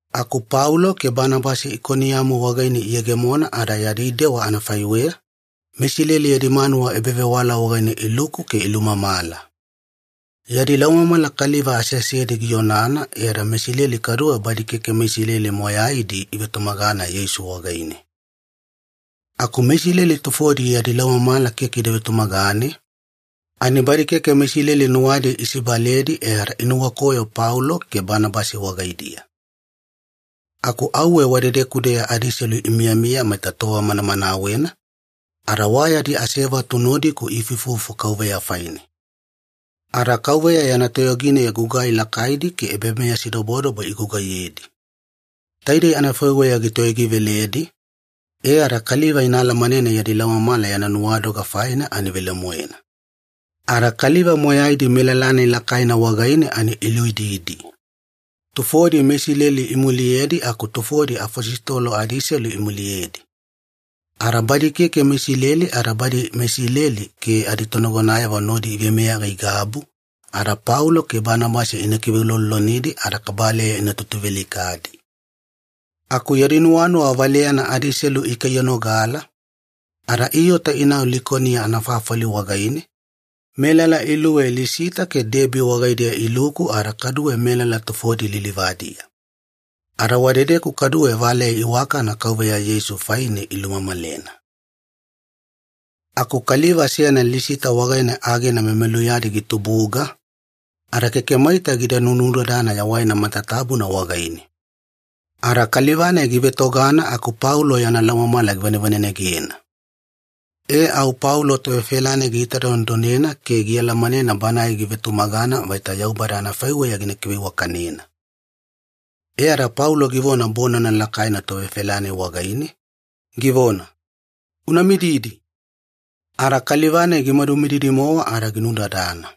Aku Paulo ke Banabasi Ikoniyamu wagaine iyegemona ada yadi dewa anafaiweya, meIsileli yadi manuwa ebavewala wagaine iluku ke ilumamala. Yadi laumamala kaliva aseasedi gionana e ada meIsileli kaduwe badi keke meIsileli moyaidi ivetumagana Yeisu wagaine. Aku meIsileli tufodi yadi laumamala keke ida vetumagane, ani badi keke meIsileli nuwadi isibaledi e ada inuwakoyo Paulo ke Banabasi wagaidiya. Aku auwe wadedeku-deya adiselu imiyamiya maita tova manamanawena, ada wa yadi asevatu nodiku iifuifufu Kauveya faine. Ada Kauveya yana toyogineya gugai lakaidi ke ebameyasidobodobo igugaiyedi. Taidei anafaiweya gitoyogiveledi, e ada kaliva ina alamanena yadi laumamala yana nuwadoga faina ani velemoena. Ada kaliva moyaidi melala-nai lakaina wagaine ani iluididi. Tufodi meIsileli imuliyedi aku tufodi afositolo adiselu imuliyedi. Ada badi keke meIsileli ada badi meIsileli ke aditonagonayavo nodi iveimeya aigaigabu ada Paulo ke Banabasi ina kiveuloulolonidi ada kabaleya ina tutuvealikadi. Aku yadi nuwanuwa valeyana adiselu ikaiyanogala, ada iota inau Likoniya anafafali wagaine, melala iluwei Lisita ke Debi wagaidiya iluku ada kaduwe melala tufodi lilivadiya. Ada wadedeku kaduwe valeya iwakana Kauveya Yeisu faine ilumamalena. Aku kaliva seyana Lisita wagaine agena memeluyadi gitubuga, ada keke maita gida nunudadana yawaina matatabuna wagaine. Ada kaliva-nai givetogana aku Paulo yana laumamala givanevanenegena. E au Paulo tovefela-nai giitaitadonena ke gialamanena banae givetumagana vaita Yaubada anafaiweya gina kiveiwakanena. E ada Paulo givona bonana lakaina tovefela-nai wagaine, givona, “Una mididi!” Ada kaliva-nai gimadumididi-mowa ada ginudadana.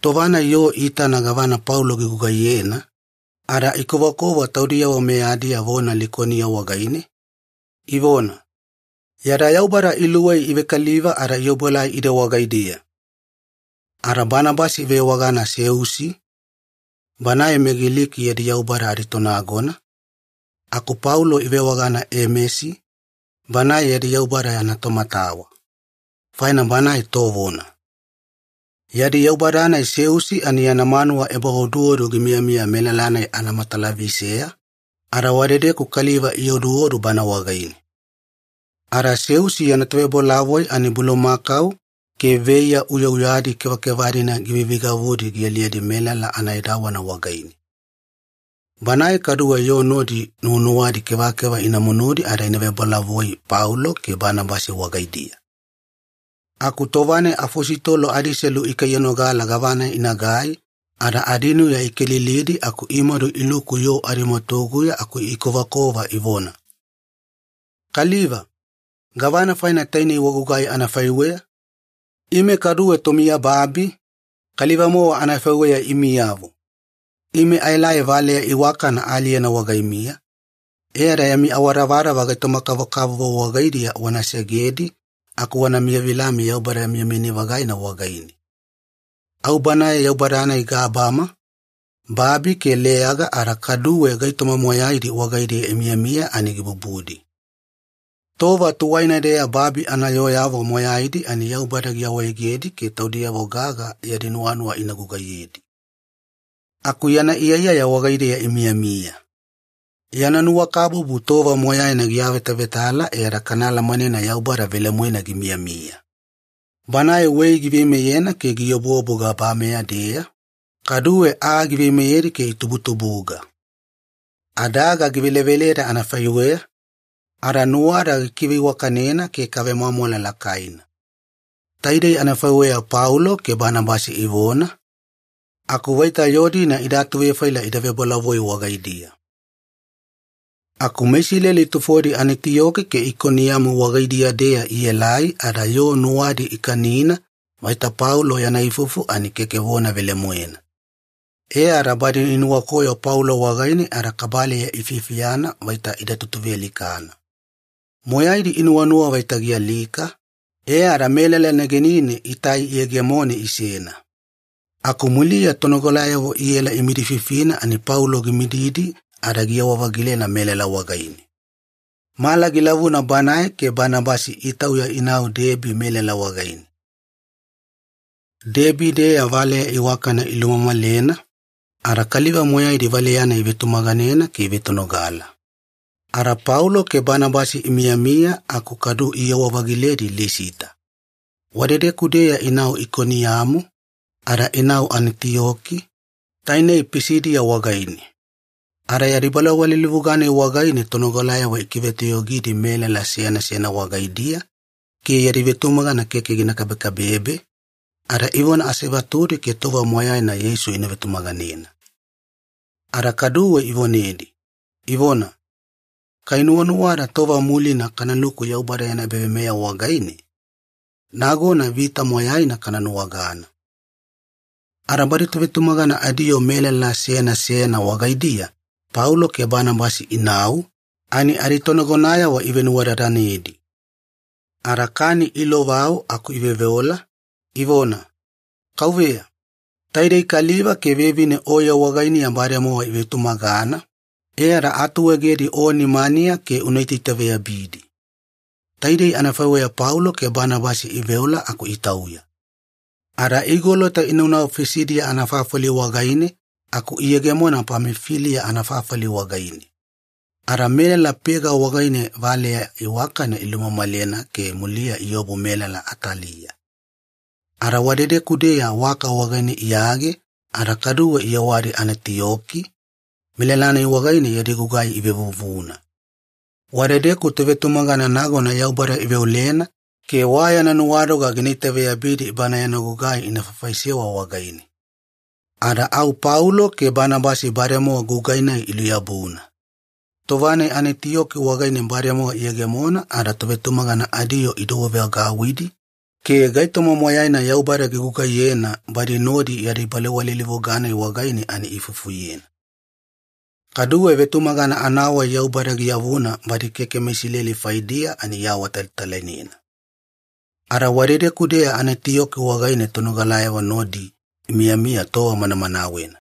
Tova-nai yoo iitana gavana Paulo gigugaiyena, ada ikovakova taudiyavo meyadiya vona Likoniya wagaine, ivona, “Yada yaubada iluwei ivekaliva ada iobuelai ide wagaideya!” Ada Banabasi ivewagana Seusi, banae meGiliki yadi yaubada aditonagona, aku Paulo ivewagana Emesi, banae yadi yaubada yana tomatawa. Faina banae tovona. Yadi yaubada-nai Seusi ani yana manuwa ebaoduodu gimiyamiya melala-nai anamatalaviseya, ada wadedeku kaliva ioduodu bana wagaine. Ada Seusi yana tovebolavoi ani bulumakau ke veiya uyauyadi kevakeva-dina giveiveigavudi gialiyedi melala anaedawana wagaine. Banae kaduwe yoo nodi nuwanuwadi kevakeva ina munudi ada ina vebolavoi Paulo ke Banabasi wagaidiya. Aku tova-nai afositolo adiselu ikaiyanogala gavana inagai ada adinuya ikelilidi aku imadu iluku yoo adimwatuguya aku ikovakova ivona, “Kaliva, gavana faina tainei wagugai anafaiweya? Ime kaduwe tomiyababi, kaliva-mowa anafaiweya imiyavo! Ime aelai valeya iwakana aaliyena wagaimiya, e ada yami awadavadava gaitoma-kavokavovo wagaidiya wana segedi aku wana miyavilami Yaubada miyamiyani-vagaina wagaine. Au Banae Yaubada-nai gabama, babi ke leyaga ada kaduwe gaitoma moyaidi wagaidiya imiyamiya ani gibubudi. Tova tuwaina-deya babi anayooyavo moyaidi ani Yaubada giawaegedi ke taudiyavo gaga yadi nuwanuwa ina gugaiyedi. Aku yana iyaiyaya wagaideya imiyamiya. Yana nuwakabubu tova moyaina giavetavetala e ada kana alamanena Yaubada velemoena gimiyamiya. Banae wei giveimeyena ke giobuobu gabameya-deya, kaduwe aa giveimeyedi ke itubutubuga. Adaga giveleveleda adafaiweya, ada nuwada gikiveiwakanena ke kavemwamwala lakaina.” Taidei anafaiweya Paulo ke Banabasi ivona, aku vaita yoo-dina ida atuvefaila ida vebolavoi wagaidiya. Aku meIsileli tufodi Anitiyoki ke Ikoniyamu wagaidiya-deya ielai ada yoo nuwadi ikanina vaita Paulo yana ifufu ani keke vona velemoena. E ada badi inuwakoyo Paulo wagaine ada kabaleya ifiyafiyana vaita ida tutuvealikana. Moyaidi inuwanuwa vaita gialika, e ada melala negenine itai iyegemone isena. Aku muliya tonogalayavo iela imidififina ani Paulo gimididi ada giyewa-vagilena melala wagaine. Mala gilavuna banae ke Banabasi itauya inau Debi melala wagaine. Debi-deya valeya iwakana ilumamalena, ada kaliva moyaidi valeya-nai ivetumaganena ke ivetonogala. Ada Paulo ke Banabasi imiyamiya aku kadu iyewa-vagiledi Lisita. Wadedeku-deya inau Ikoniyamu, ada inau Anitiyoki, tainei Pisidiya wagaine. Ada yadi balawalilivuga-nai wagaine tonogalayavo ikivetoyogidi melala seyana seyana wagaidiya ke yadi vetumagana keke gina kabekabebe, ada ivona asevatudi ke tova moyaina Yeisu ina vetumaganena. Ada kaduwe ivonedi, ivona, “Kai nuwanuwada tova mulina kanaluku Yaubada yana ebaveimeya wagaine, nagona vita moyaina kana nuwagana.” Ada badi tovetumagana adiyoo melala seyana seyana wagaidiya Paulo ke Banabasi inau, ani aditonagonayavo ivenuwadadanedi. Ada kani iilovau aku iveoveola, ivona, “Kauveya, taidei kaliva ke vevine Oye wagainiya bademowa ivetumagana, e ada aatuegedi Oye nimaniya ke una itaitaveyabidi.” Taidei anafaiweya Paulo ke Banabasi iveola aku itauya. Ada igolota inaunau Pisidiya anafafali wagaine aku iyegemona Pamifiliya anafafali wagaine. Ada melala Pega wagaine valeya iwakana ilumamalena ke muliya iobu melala Ataliya. Ada wadedeku-deya waka wagaine iyage ada kaduwe iyewadi Anitiyoki, melala-nai wagaine yadi gugai ivevuvuna. Wadedeku tovetumagana nagona Yaubada iveolena ke wa yana nuwadoga gina itaveyabidi Bana yana gugai ina faifaisewa wagaine. Ada au Paulo ke Banabasi bademowa gugai-nai iluyabuna. Tova-nai Anitiyoki wagaine bademowa iyegemona ada tovetumagana adiyoo idouwevagauwidi ke gaitoma moyaina Yaubada gigugaiyena badi nodi yadi balawalilivuga-nai wagaine ani iifufuyena. Kaduwe vetumagana anawai Yaubada giyavuna badi keke meIsileli faidiya ani iawatalatalainena. Ada wadedeku-deya Anitiyoki wagaine tonogalayavo nodi imiyamiya tova manamanawena.